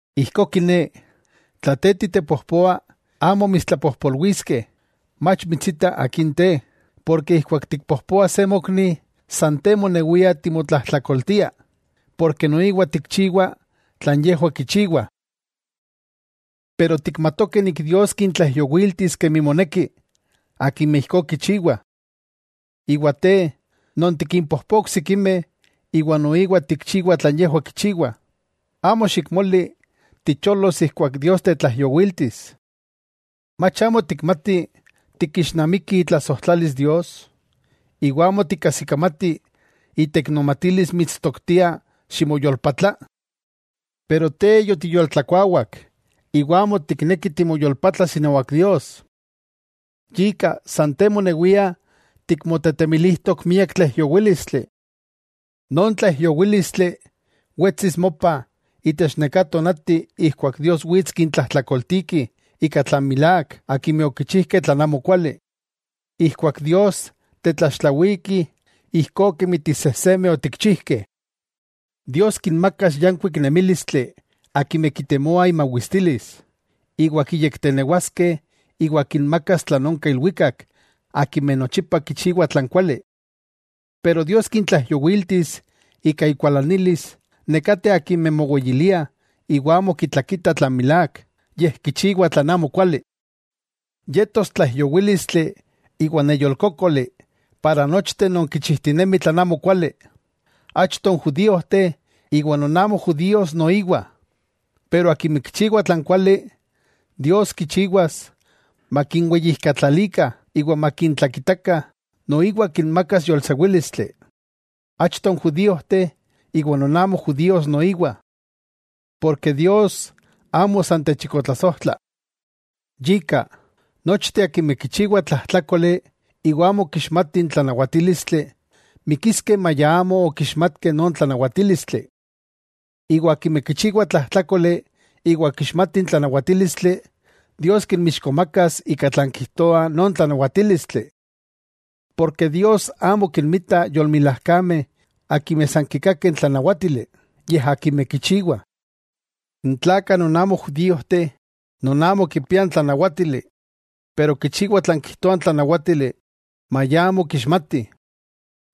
Ijkó kiné, tla te titepojpoa amo mitstlapojpolwiskeh, mach mitsita akin te, porke ijkuak tikpojpoa se mokni, san te monewia timotlajtlakoltia, porke noiwa tikchiwa tlan yejwah kichiwah. Tejwah tikmatokeh Dios kintlaijyowiltis kemi moneki, akimeh ijkó kichiwah. Iwa te, non tikinpojpoa oksikimeh iwa noiwa tikchiwa tlan yejwah kichiwah, amo xikmoli ticholos ijkuak Dios tetlaijyowiltis. Mach amo tikmati tikixnamiki itlasojtlalis Dios, iwa amo tikkajsikamati iteiknomatilis mitstoktia ximoyolpatla. Pero te yotiyoltlakuawak iwa amo tikneki timoyolpatlas inawak Dios. Yika san te monewia tikmotetemilijtok miak tlaijyowílistli. Non tlaijyowílistli wetsis mopa itech neká tonati ijkuak Dios wits kintlajtlakoltiki ika tlan milák akimeh okichijkeh tlan amokuali. Ijkuak Dios tetlaxtlawiki ijkó kemi ti sejsemeh otikchijkeh: Dios kinmakas yankuik nemílistli akimeh kitemoa imawistilis, iwa kinyektenewaskeh iwa kinmakas tlan onka ilwikak akimeh nochipa kichiwah tlan kuali. Pero Dios kintlaijyowiltis ika ikualanilis nekateh akimeh moweyiliah iwa amo kitlakitah tlan milák, yej kichiwah tlan amokuali. Yetos tlaijyowílistli iwa neyolkókoli para nochteh non kichijtinemih tlan amokuali, achto n judíojteh iwa non amo judíos noiwa. Pero akimeh kichiwah tlan kuali, Dios kichiwas makinweyijkatlalikah iwa makintlakitakah. Noiwa kinmakas yolsewílistli, achto n judíojteh iwa non amo judíos noiwa. Porke Dios amo san techikotlasojtla, yika, nochteh akimeh kichiwah tlajtlákoli iwa amo kixmatih n tlanawatílistli, mikiskeh maya amo okixmatkeh non tlanawatílistli. Iwa akimeh kichiwah tlajtlákoli iwa kixmatih n tlanawatílistli, Dios kinmixkomakas ika tlan kijtoa non tlanawatílistli. Porke Dios amo kinmita yolmilajkameh akimeh san kikakih n tlanawátili, yej akimeh kichiwah. N tlakah non amo judíojteh, non amo kipiah n tlanawátili, pero kichiwah tlan kijtoa n tlanawátili maya amo kixmatih,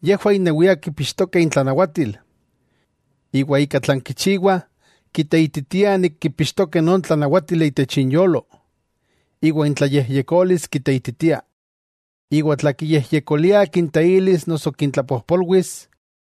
yejwah innewiah kipixtokeh intlanawatil. Iwa ika tlan kichiwah kiteititiah nik kipixtokeh non tlanawátili itech inyolo. Iwa intlayejyekolis kiteititia, iwa tlan kiyejyekoliah kinteilis noso kintlapojpolwis,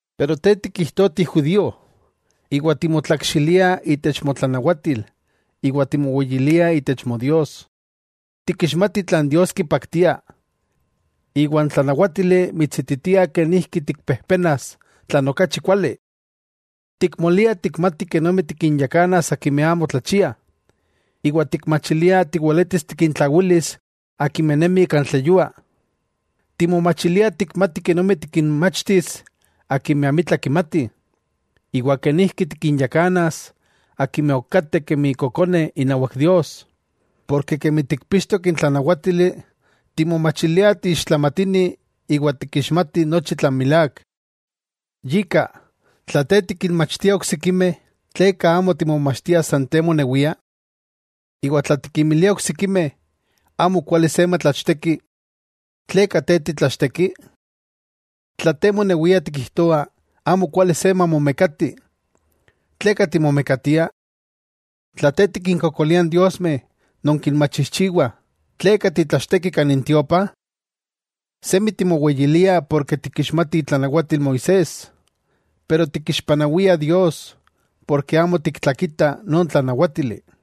Pero te tikijtoa ti judío, iwa timotlakxilia itech motlanawatil iwa timoweyilia itech Modios. Tikixmati tlan Dios kipaktia, iwa n tlanawátili mitsititia kenijki tikpejpenas tlan okachi kuali. Tikmolia tikmati kenomi tikinyakanas akimeh amo tlachiah, iwa tikmachilia tiweletis tikintlawilis akimeh nemih kan tleyua. Timomachilia tikmati kenomi tikinmachtis akimeh amitla kimatih, iwa kenijki tikinyakanas akimeh ok kateh kemi kokoneh inawak Dios, porke kemi tikpixtok n tlanawátili timomachilia tiixtlamatini iwa tikixmati nochi tlan milák. Yika, tla te tikinmachtia oksikimeh, ¿tleka amo timomachtia san te monewia? Iwa tla tikinmilia oksikimeh amokuali se matlachteki, ¿tleka te titlachteki? Tla te monewia tikijtoa amo kuali se mamomekati, ¿tleka timomekatia? Tla te tikinkokolia n diosmeh non kinmachijchiwah, ¿tleka titlachteki kan intiopa? Semi timoweyilia porke tikixmati itlanawatil Moisés, pero tikixpanawia Dios porke amo tiktlakita non tlanawátili.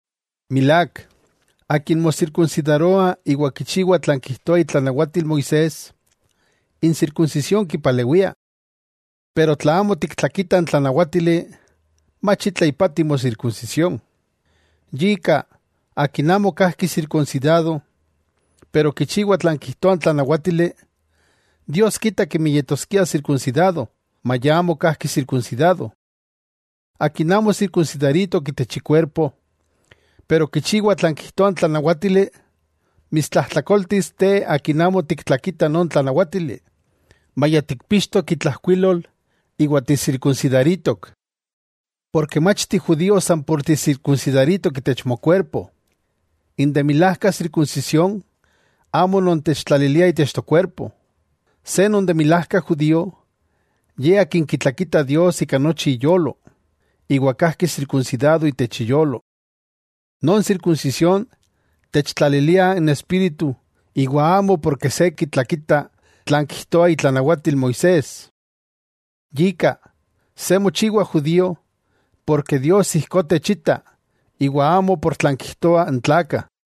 Milák, akin mosirkunsidaroa iwa kichiwa tlan kijtoa itlanawatil Moisés, n sirkunsisión kipalewia. Pero tla amo tiktlakita n tlanawátili, mach itla ipati mosirkunsisión. Yika akin amo kajki sirkunsidado pero kichiwa tlan kijtoa n tlanawátili, Dios kita kemi yetoskia sirkunsidado maya amo kajki sirkunsidado. Akin amo sirkunsidaritok itech ikuerpo, pero kichiwa tlan kijtoa n tlanawátili, mitstlajtlakoltis te akin amo tiktlakita non tlanawátili maya tikpixtok itlajkuilol iwa tisirkunsidaritok. Porke mach ti judío san por tisirkunsidaritok itech mokuerpo. N de milajka sirkunsisión amo non techtlaliliah itech tokuerpo. Se non de milajka judío, ye akin kitlakita Dios ika nochi iyolo, iwa kajki sirkunsidado itech iyolo. Non sirkunsisión techtlalilia n Espíritu iwa amo porke se kitlakita tlan kijtoa itlanawatil Moisés. Yika, se mochiwa judío, porke Dios ijkó techita, iwa amo por tlan kijtoah n tlakah.